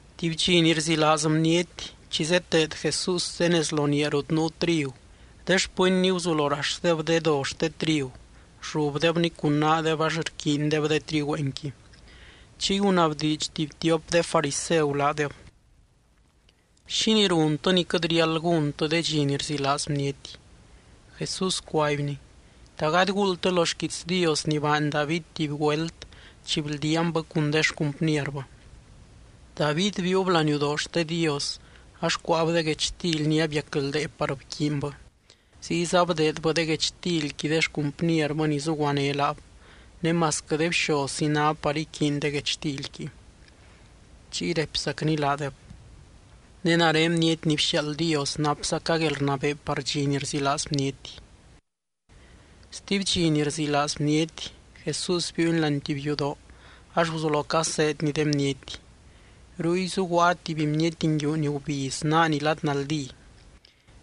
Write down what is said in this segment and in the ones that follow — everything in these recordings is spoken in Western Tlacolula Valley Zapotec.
Tuby dxi ni rzilaaz bniety, chi zeteed Jesús de nez lo niaa rut nuu trigu, de xpɨnny guzulo raxdeb de do xte trigu, rllubdebni cun naadeb ax rquiindeb de trigüeenqui. Chiy gunabdiidx tuby tiop de fariseu laadeb: —¿Xínii runtɨ ni quɨt riáld gúntɨ de dxi ni rzilaaz bniety? Jesús cuaibny: —¿Ta gady guuldtɨ lo xquiits Dios ni baany David tuby güelt chi bldiaanbɨ cun de xcumpnierbɨ? David biiub láani yudoo xte Dios ax cuáab de guechtily ni abiacldee par bquiinbɨ. Ziyza bdeedbɨ de guechtilqui de xcumpnierbɨ ni zuguané laab, ne masquɨ de bxozzi ná par iquiiny de guechtilqui. Chiy raipzacny laadeb: —Ne nare Bniety ni bxiaald Dios napzaca guelrnabee par dxi ni rzilaaz bniety. Stuby dxi ni rzilaaz bniety, Jesús biiuny láani tuby yudoo ax guzulo caseedny de bniety. Ruy zuguaa tuby bniety nguiu ni gubiz naani lad naldí.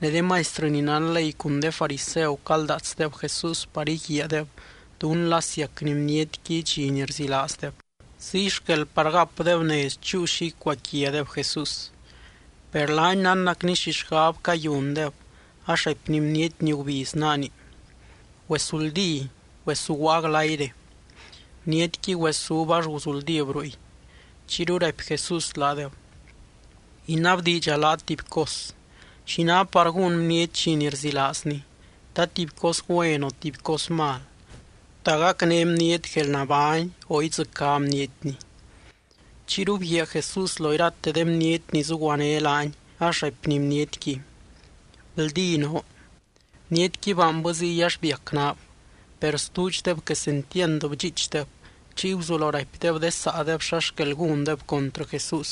Ne de maistrɨ ni nán ley cun de fariseu caldaatsdeb Jesús par íguiaadeb dún la siacny bnietqui dxi ni rzilaazdeb, ziy xquel par gapdeb nez chúu xi icuaquiadeb Jesús. Per laany nánnacny xi xgab cayundeb ax raipny bniety ni gubiz naani: —Güesuldí. Güezuguaa glayre. Bnietqui güesúb ax guzuldíb ruy. Chiyru raipy Jesús laadeb: —Inabdiidxa laat tuby cos: ¿Xi ná par gún bniety dxi ni rzilaazni? ¿Ta tuby cos güen o tuby cos mal? ¿Ta gacné bniety guelnabány o idzɨcá bnietni? Chiyru bguiaa Jesús lo irate de bniety ni zuguané laany ax raipny bnietqui: —Bldí noo. Bnietqui baanbɨ ziy ax biac naab. Per stuudxdeb quesentiand bdxiichdeb, chiy guzulo raipdeb de saadeb xa xquel gúndeb contrɨ Jesús.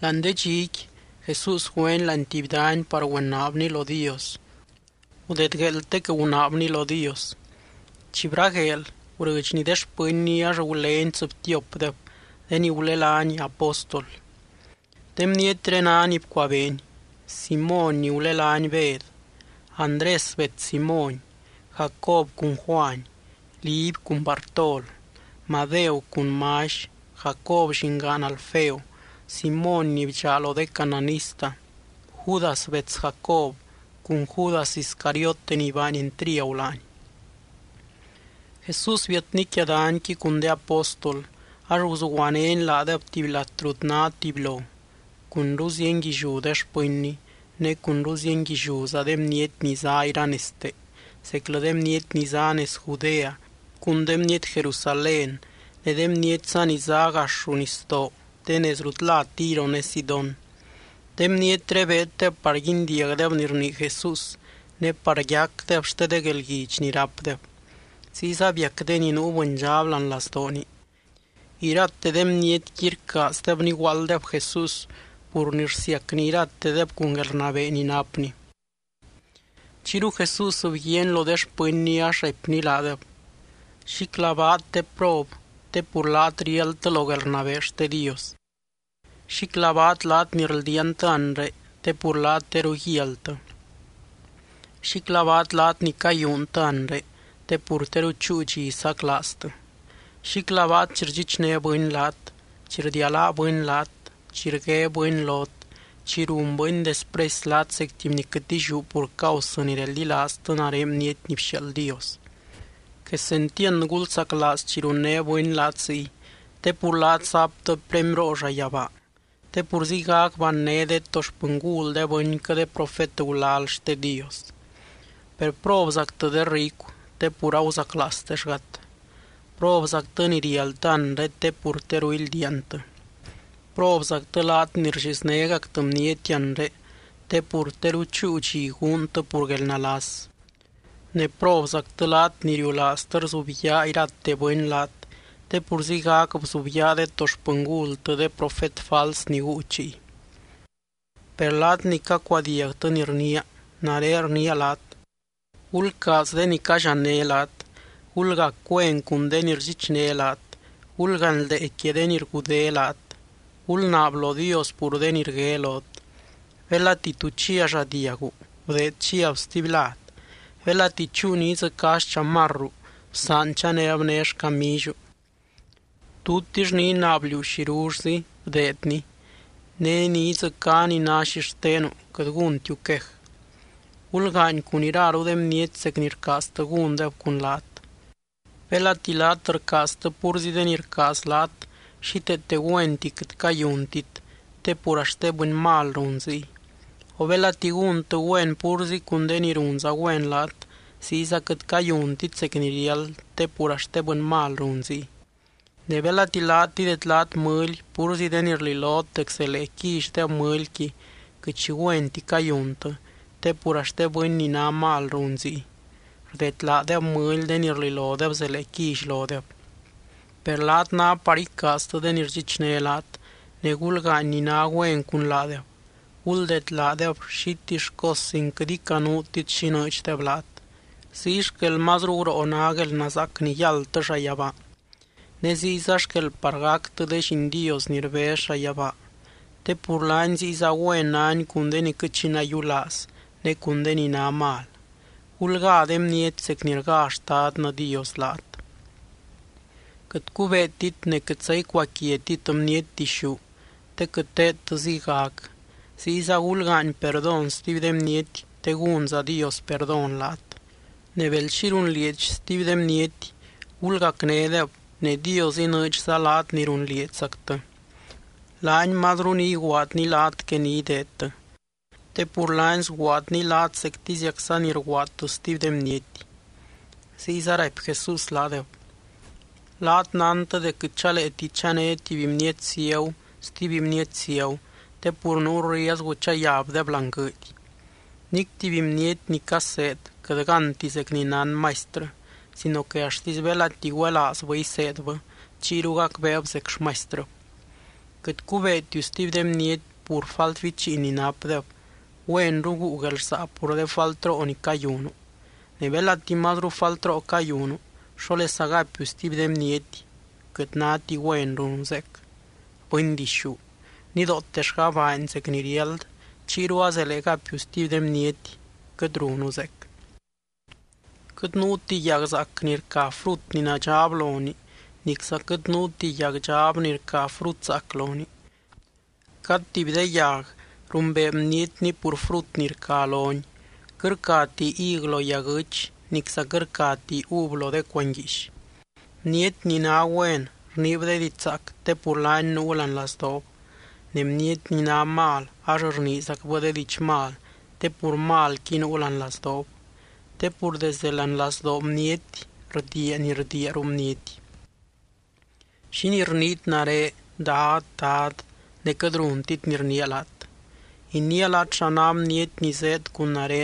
Láani de dxiqui, Jesús güeny láani tuby dany par güenaabny lo Dios. Gudedgueeltec gunaabny lo Dios. Chi bragueel, gurɨdxny de xpɨnny ax gulény tsɨbtiopdeb de ni gulelány apóstol. De bnietré ná ni bcuabeeny: Simóny ni gulelány Bed, Andrés bets Simóny, Jacob cun Juany, Liby cun Bartol, Madeu cun Mally, Jacob llingaan Alfeo, Simóny ni bdxaa lo de cananista, Judas bets Jacob cun Judas Iscariote ni baany entriagu laany. Jesús biatny quia danyqui cun de apóstol. Ax guzuguanény laadeb tuby lat rut ná tubylo, cunru zienguilliú de xpɨnny, ne cunru zienguilliúza de bniety ni zá iranezte, zeclɨ de bniety ni zá nez Judea, cun de bniety Jerusalén ne de bnietza ni zá gax ruu nisdoo de nez rut lá Tiro ne Sidón. De bnietré beeddeb par guindiagdeb ni rnii Jesús ne par yacdeb xte de guelguidx ni rápdeb. Ziyza biac de ni nuu bɨndxab láani lazdooni. Irate de bnietqui rcaazdeb niguaalddeb Jesús pur ni rsiacny iratedeb cun guelrnabee ni napny. Chiyru Jesús bguiaany lo de xpɨnny ax raipny laadeb: —Xíclabaat, de prob, te pur laat riáldtɨ lo guelrnabee xte Dios. ’Xíclabaat laat ni rldiaantɨ anre te pur laat teru guialtɨ. ’Xíclabaat, laat ni cayúuntɨ anre, te pur teru chúu dxi saclaaztɨ. ’Xíclabaat chi rdxichné bɨny laat, chi rdialáa bɨny laat, chi rgué bɨny lot, chi run bɨny despresy laat zec tuby ni quɨt illiú pur causɨ ni reldilaaztɨ nare Bniety ni bxiaald Dios. Quesentiand gulzaclaaz chi runné bɨny laat ziy, te pur laat zaptɨ premyroo llayabaa. Te pur ziygac banné de to xpɨngul de bɨnquɨ de profet gulal xte Dios. ’Per probzactɨ, de ricu, te pur aguzaclaaztexgat. ’Probzactɨ ni rialtɨ anre te pur teru ildiaantɨ. ’Probzactɨ laat ni rlliznégactɨ bniety anre te pur teru chúu dxi guuntɨ pur guelnalas. ’Ne probzactɨ laat ni riulaaztɨ rzubyaa irate bɨny laat te pur ziygac bzubyaa de to xpɨngultɨ de profet fals ni guu chiy. ’Per laat ni cacuadiagtɨ ni rniia, nare rniia laat: gulcaaz de ni callianné laat. Gulgac güen cun de ni rdxichné laat. Gulganldee quia de ni rgudé laat. Gulnaab lo Dios pur de ni rgué lot. Belati tu chia lladiagu, bdeed chiab stuby lad. Belati chúu ni idzɨcá xchamarru, bsaan chanéb né xcamilliu. Tutix ni inaab liú xirullzi, bdeedni. Ne ni idzɨcá ni ná xixtenu, quɨt gúntiu quej. Gulgaany cun iraru de bniety zec ni rcaaztɨ gúndeb cun laat. ’Belati laat rcaaztɨ púrzi de ni rcaaz laat, xíteete güenti quɨt cayuntit, te pur axt de bɨny mal run ziy. O belati gúntɨ güen púrzi cun de ni runza güen laat, ziyza quɨt cayuntit zec ni riáld te pur axt de bɨny mal run ziy. Ne belati laat idedlaat mɨly púrzi de ni rlilot dec zelee quillydeb mɨlyqui, quɨt xi güenti cayuntɨ te pur axt de bɨny ni ná mal run ziy. Rdedlaadeb mɨly de ni rlilodeb zelee quilly lodeb. Per laat ná par icaaztɨ de ni rdxichné laat, ne gulgaany ni ná güen cun laadeb. Guldeed laadeb xitill cos sin quɨt icanuutit xi inɨɨdxdeb laat. Ziy xquel mazru guroo ná guelnazaac ni yáldtɨ llayabaa. Ne ziyza xquel par gactɨ de lliin Dios ni rbez llayabaa, te pur laany ziyza güen nány cun de ni quɨt xi nayiulaaz ne cun de ni ná mal. Gulgá de bniety zec ni rgá Xtadnɨ Dios laat. ’Quɨt cubeetit ne quɨtza icuaquiatit bniety dixú te quɨt teedtɨ ziygac. Ziyza gulgaany perdón stuby de bniety te gúnza Dios perdón laat. Ne bel xi runlieedx stuby de bniety, gulgacnédeb ne Dios inɨɨdxza laat ni runlieedxzactɨ. Laany mazru ni iguaadny laat que ni ideedtɨ. Te pur laany sguaadny laat zectiziacza ni rguaadtɨ stuby de bniety. Ziyza raipy Jesús laadeb: —Laat nántɨ dec quɨt chaleeti chané tuby bniety ciagu stuby bniety ciagu te pur nuu riezgu chayabdeb láani guɨɨdy. Nic tuby bniety ni caseed quɨt gánti zec ni nán maistrɨ sino que axtisy belati güelaazbɨ iseedbɨ, chiyru gacbeeb zec xmaistrɨb. ’Quɨt cubeetiu stuby de bniety pur falt bichiin ni napdeb güenru guu guelrsaa pur de faltroo ni cayunu. Ne belati mazru faltroo cayunu, ¿xólesa gapiu stuby de bniety: “Quɨt náti güen runu zeec”? ¡Bɨndixú! Nidootellga baany zec ni riáld, chiyru a zélee gapiu stuby de bniety: quɨt runu zeec. ’Quɨt nuuti yag zaac ni rca frut ni nadxab lonii. Nicza quɨt nuuti yag dxab ni rca frut zaac lonii. Cad tuby de yag rumbee bnietni pur frut ni rca loni. Quɨt rcati hig lo yaguɨ́ch nicza quɨt rcati uv lo de cuanguiix. Bniety ni ná güen rniib de diidx zaac te pur laani nuu láani lazdoob. Ne bniety ni ná mal ax rniizacbɨ de diidx mal te pur malqui nuu láani lazdoob. Te pur desde láani lazdoo bniety rdiia ni rdiia ruu bniety. ’¿Xínii rniit nare “Dad, Dad” ne quɨt runtit ni rniia laat? Iniia laat xa ná bniety ni zéed cun nare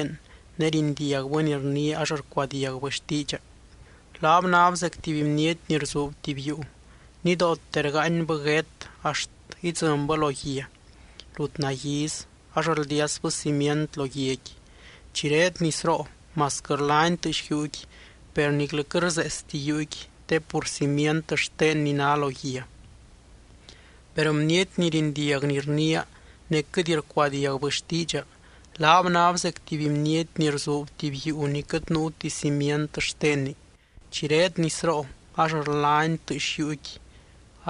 ne rindiagbɨ ni rniia ax rcuadiagbɨ xtiidxa: Laab náb zec tuby bniety ni rzuub tuby yuu. Nidoote rgaanybɨ guét axt idzɨnbɨ lo guia rut naguiiz ax rldiasbɨ cimient lo guiaqui. Chi reed nisroo masquɨ rlani tɨɨx yuuqui, per niclɨ quɨt rseestini yuuqui te pur cimient xtenni ná lo guia. Per bniety ni rindiag ni rniia, ne quɨt rcuadiagbɨ xtiidxa, laab náb zec tuby bniety ni rzuub tuby yuu ni quɨt nuu cimient xtenni. Chi reed nisroo ax rlani tɨɨx yuuqui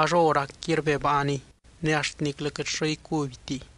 ax hóracqui rbebaaniy. Ne axt niclɨ quɨt xo icubytiy.